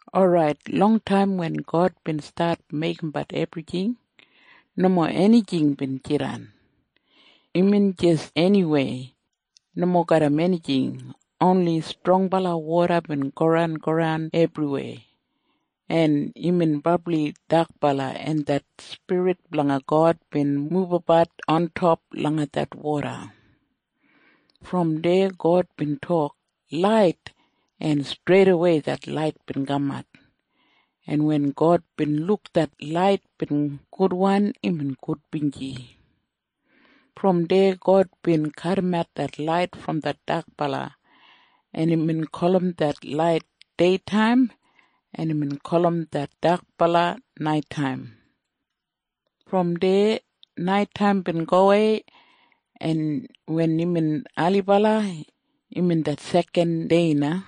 Orait, longtaim wen God bin stat meigimbat ebrijing, nomo enijing bin jidan. Imbin jis eniwei, nomo garram enijing. Oni strongbala woda bin goran goran ebriwei, en imbin brabli dakbala, en det Spirit blanga God bin mubabat ontop langa det woda. Brom deya God bin tok, “Lait!” En streidawei det lait bin kamat. En wen God bin luk det lait bin gudwan, imbin gudbinji. Brom deya God bin kadimat det lait brom det dakbala, en imbin gulum det lait Deitaim, en imbin gulum det dakbala Naitaim. Brom deya naitaim bin gowei, en wen imbin ailibala, imbin det sekan dei na.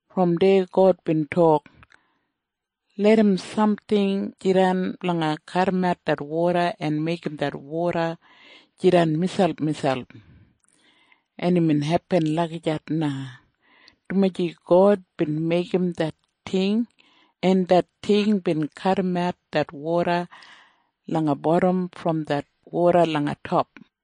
Brom deya God bin tok, “Larram samting jidan blanga kadimat det woda en meigim det woda jidan miselpmiselp.” En imbin hepin lagijat na, dumaji God bin meigim det ting, en det ting bin kadimat det woda langa bodam brom det woda langa top,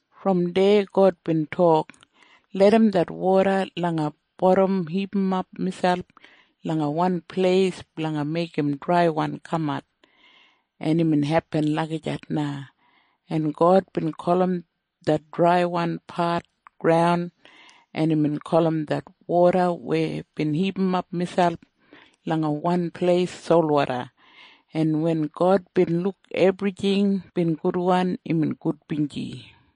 Brom deya God bin tok, “Larram det woda langa bodam hipimap miselp langa wan pleis blanga meigim draiwan kamat.” En imbin hepin lagijat na, en God bin gulum det draiwan pat Graun, en imbin gulum det woda weya bin hipimap miselp langa wan pleis Solwoda. En wen God bin luk ebrijing bin gudwan, imbin gudbinji.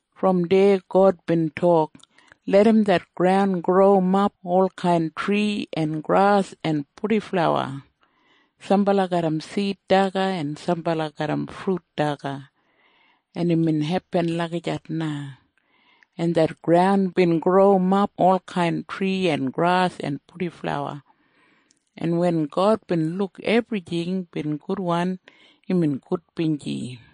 Brom deya God bin tok, “Larram det graun growimap olkain tri en gras en purdiflawa, sambala garram sid daga en sambala garram frut daga.” En imbin hepin lagijat na, en det graun bin growimap olkain tri en gras en purdiflawa. En wen God bin luk ebrijing bin gudwan, imbin gudbinji.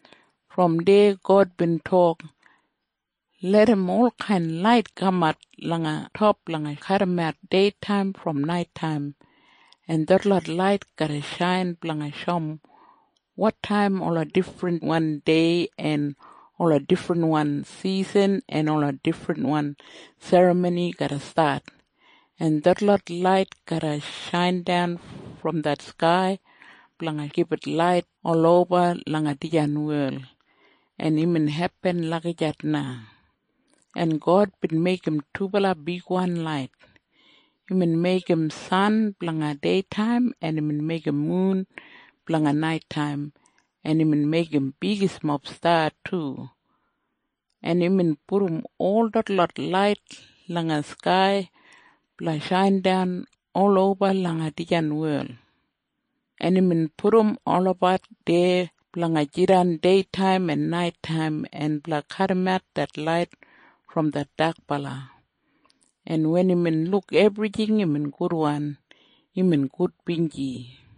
Brom deya God bin tok, “Larram olkain lait kamat langa top blanga kadimat deitaim brom naitaim, en detlot lait garra shain blanga shoum wotaim ola difrinwan dei en ola difrinwan sisan en ola difrinwan serramoni garra stat, en detlot lait garra shaindan brom det skai blanga gibit lait oloba langa dijan wel.” En imbin hepin lagijat na, en God bin meigim dubala bigwan lait. Imbin meigim san blanga deitaim, en imbin meigim mun blanga naitaim, en imbin meigim bigismob sta du, en imbin pudum ol detlot lait langa skai blanga shaindan oloba langa dijan wel, en imbin pudum olabat deya blanga jidan deitaim en naitaim en blanga kadimat det lait brom det dakbala. En wen imbin luk ebrijing bin gudwan, imbin gudbinji.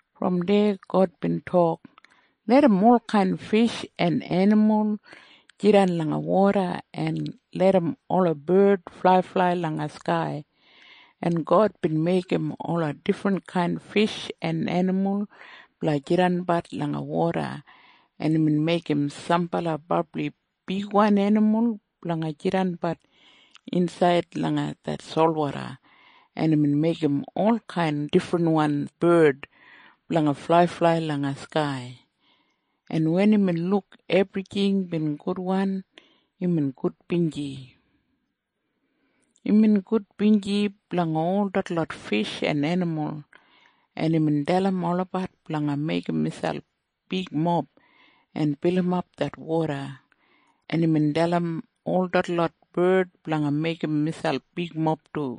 Brom deya God bin tok, “Larram olkain fish en enimul jidan langa woda, en larram ola bard flaiflai langa skai.” En God bin meigim ola difrinkain fish en enimul blanga jidanbat langa woda en imbin meigim sambala brabli bigwan enimul blanga jidanbat insaid langa det solwoda, en imbin meigim olkain difrinwan bard blanga flaiflai langa skai. En wen imbin luk ebrijing bin gudwan, imbin gudbinji. Imbin gudbinji blanga ol detlot fish en enimul, en imbin dalim olabat blanga meigim miselp bigmob en bilimap det woda, en imbin dalim ol detlot bard blanga meigim miselp bigmob du.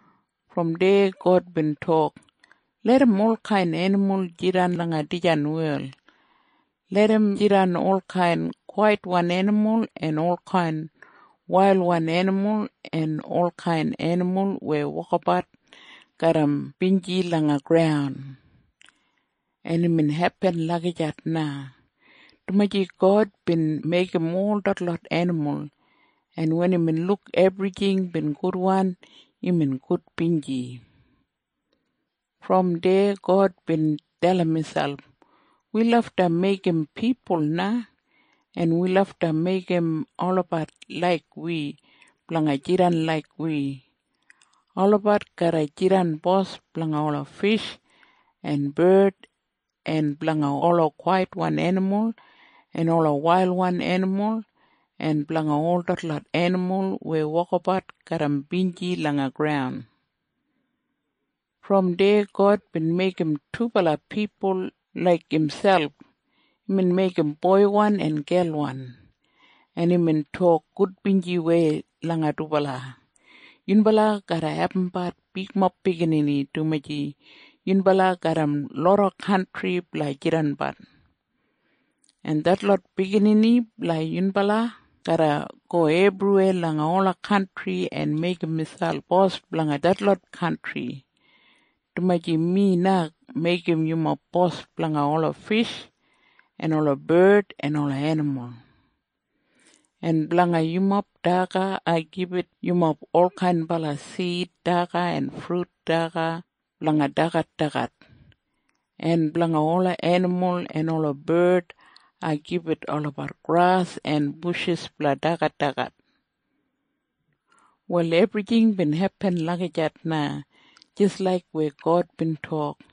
Brom deya God bin tok, “Larram olkain enimul jidan langa dijan wel. Larram jidan olkain kwaitwan enimul en olkain wailwan enimul en olkain enimul weya wokabat garram binji langa graun.” En imbin hepin lagijat na, dumaji God bin meigim ol detlot enimul. En wen imbin luk ebrijing bin gudwan, imbin gudbinji. Brom deya God bin dalim miselp, “Wi lafta meigim pipul na. En wi lafta meigim olabat laik wi blanga jidan laik wi. Olabat garra jidan bos blanga ola fish en bard en blanga ola kwaitwan enimul en ola wailwan enimul en blanga ol detlot enimul weya wokabat garram binji langa graun.” Brom deya God bin meigim dubala pipul laik imselp. Imbin meigim boiwan en gelwan, en imbin tok gudbinjiwei langa dubala, “Yunbala garra abumbat bigmob biginini, dumaji yunbala garram loda kantri blanga jidanbat. En detlot biginini blanga yunbala garra go ebriweya langa ola kantri en meigim miselp bos blanga detlot kantri, dumaji mi na meigim yumob bos blanga ola fish en ola bard en ola enimul. En blanga yumob daga ai gibit yumob olkain sid daga en frut daga blanga dagadagat. En blanga ola enimul en ola bard ai gibit olabat gras en bushis blanga dagadagat.” Wal ebrijing bin hepin lagijat na jis laik weya God bin tok.